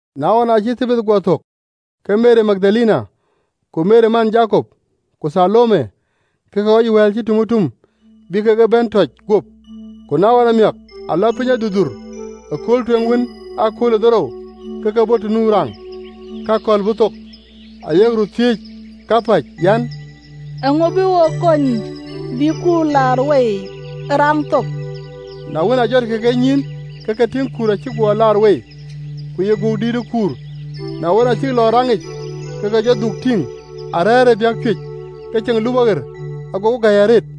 Na wën, aacï Thabath guɔ thök, ke Meri Magdalene, ku Meri man Jakop, ku Thalome, ke ke ɣɔc wɛ̈ɛ̈l cï tumëtum, bï kek e bɛ̈n tɔc guöp. Ku na ɣɔn amiäk aa lɔ piny durdur, ëkööl tueŋ wën ee akööl dhorou, ke ke bɔ̈ të nu raŋ, ke akɔ̈l bɔ̈ thok. Ayek röt thiëëc kapäc an, “Eeŋa bï wo kony bï kuur laar wei ë raŋ thok?” Na wën, aa jɔtkï kenyïïn, ke ke tïŋ kuur acï guɔ laar wei: ku ye gökdïït ë kuur. Na wën, aa cïk lɔ ë raŋic, ke ke jɔ dhuk tïŋ arɛ̈ɛ̈r ë biäk cuëëc, ke ceŋ lupɔ ɣer, agokï gäi arëët.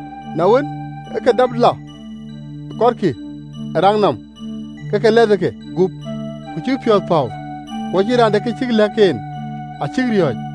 Na wën, ë ke dap lɔ kɔtkï ë raŋ nɔm: ke ke lɛthë gup ku cïk piɔ̈ɔ̈th päu: ku acïn raan de kë cïk lɛ̈k en, acïk riɔ̈ɔ̈c.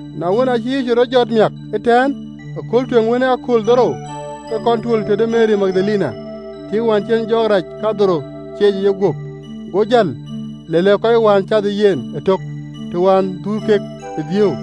Na wën, aacï Yecu rɔt jɔt miäk ëtɛ̈ɛ̈n ëkööl tueŋ wën ee akööl dhorou, ke kɔn tuöl tëde Meri Magdalene, tiiŋ wään cï en jɔɔk rac kadhorou cieec ë yeguöp. Go jäl, le lɛ̈k kɔc wään cath ë yen ëtök, të wään dhuöör kek ë dhiëëu.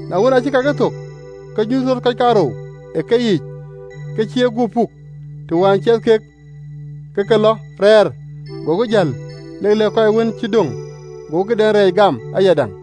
Na wën, aacï kakë thök, ke nyuth rɔt kɔc kaarou ë keyiic ke cï eguöp puk, të wään ciɛth kek, ke ke lɔ rɛɛr. Gokï jäl lek lɛ̈k kɔc wën cï döŋ: gokï këden rɛɛc gam ayadäŋ.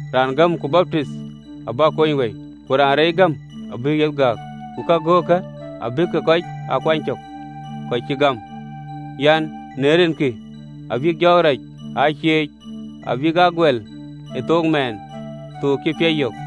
Raan gäm ku baptith abï kony wëi, ku raan reec gäm abï yiëk yeth gääk. Ku kagöökkë abïk kɔc aa kuany cök kɔc cï gam: an, në rinkï abïk jɔɔk rac aa cieec, abïk aa guɛl ë thook mɛɛn thook cï piac yök,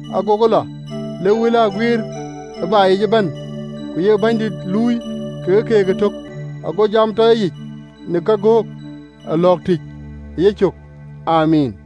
Agokï lɔ, lek wël aa guiir ë baai yic ëbɛ̈n, ku ye Bɛ̈nydït luui kekë keek ëtök, ago jam tɔ ye yic në kagöök ee lɔ̈ɔ̈k tïc ë yecök. Amiin.